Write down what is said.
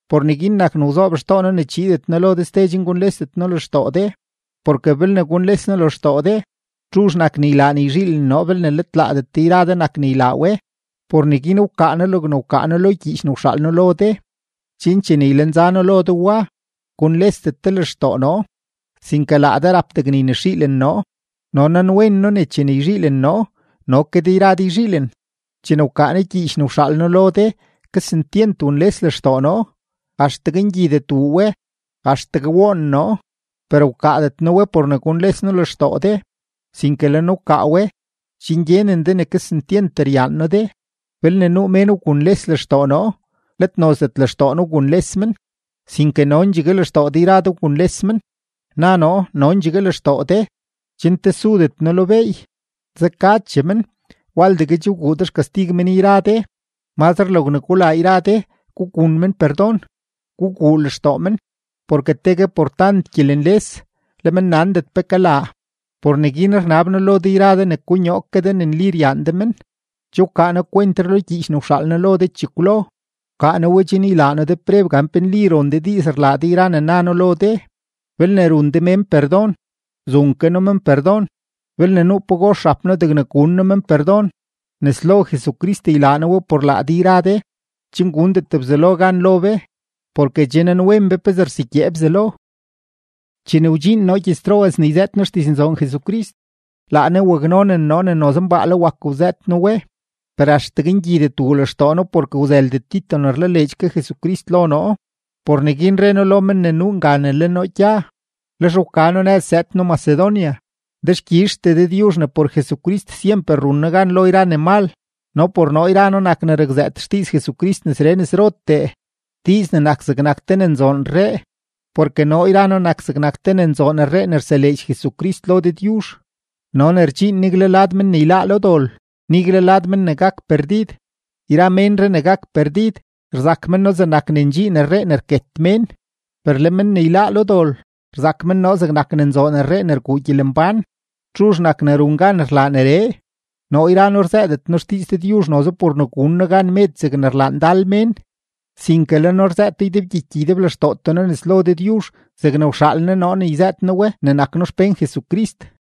Por neguin nak ne wzoob xtoo noo ne chiidet noo lo de ste chen gunlesdet noo lextoo de. Porke belne gunles noo lextoo de, ¿txuzh nak ne ylaa ne yzhiilen noo belne let laadet de yra de nak ne ylaa we? Por neguin wkaa noo logne wkaa noo lo gyiich ne wxaal noo lo de, chen chene ylenza noo lo de wa, gunlesdet de lextoo noo, sinke laa de rap degne ynexiilen noo. No nanwen noo ne chene yzhiilen noo, no ke de yra de yzhiilen. Chene wkaa noo gyiich ne wxaal noo lo de, kesentyent wunles lextoo noo, axtegue ngyidet wuu we, axtegue woon noo. Per wkaadet noo we por ne gunles noo lextoo de, sinke le noo wkaa we, chen gyenen de ne kesentyent ryaan noo de. Belne nuu mén wgunles lextoo noo, let nozdet lextoo noo wgunles men, sinke nondxegue lextoo de yra de wgunles men. Na noo “nondxegue lextoo de”, chen tesudet noo lo beey. Zekachee men, waldegue che wguu de xkastig men yra de. Mazre logne gulaa yra de, gugun men perdon, guguu lextoo men, porke tegue por tant gyelenles, le men nandet pe kalaa. Por neguin rnab noo lo de yra de ne konyoo ke de ne nli ryaan de men. Che wkaa noo kwentree lo gyiich ne wxaal noo lo de chekwlo; wkaa noo we chen ylaa noo de preb gan pe nli ron de diiz rlaa de yra ne na noo lo de. Belne run de mén perdon, zun ke noo men perdon. Belne nuu pagox rap noo degne gun noo men perdon, nes lo Jesucrist ylaa noo we por laa de yra de, chen gundet Bzelo gan lo be, porke che nanwen be pezee rsegyee Bzelo. Chene wdxiin noo gyëz-Troas ne yzëët noo xdiznzoon Jesucrist, laa Ne waknonen noo ne noze mbaale wak wzëët noo we. Per axtegue ngyidet wuu lextoo noo porke wzëldet Tito ne rlaleedx ke Jesucrist lo noo. Por neguin re noo lo men ne nuu nga ne le noo gya, lex wka noo nëz zëëd noo Macedonia. Dexkyizhtee Dëdyuzh ne por Jesucrist syemper run noo gan lo yra ne mal, no por noo yra noo nak ne rakzëët xdiiz Jesucrist nesree nesrotee, diiz ne nak zegnak te ne nzoon rree. Porke noo yra noo nak zegnak te ne nzoon rree ne rseleedx Jesucrist lo Dëdyuzh no ne rdxiin nigle lad men ne yláá lo dol, nigle lad men ne gak perdid. Yra menree ne gak perdid, rzak men noo zegnak ne ndxiin rree ne rket mén, per le men ne yláá lo dol, rzak men noo zegnak ne nzoon rree ne rguu gyelembán. ¿Txuzh nak ne run gan rlaa neree? Noo yra noo rzëëdet noo xdiiz Dëdyuzh noze por ne gun noo gan med zegne rlaa ndal mén, sinke le noo rzëëto ydebgyiky ydeblextootee noo nes lo Dëdyuzh zegne wxaal Ne noo ne yzëët noo we ne nak noo xpén Jesucrist.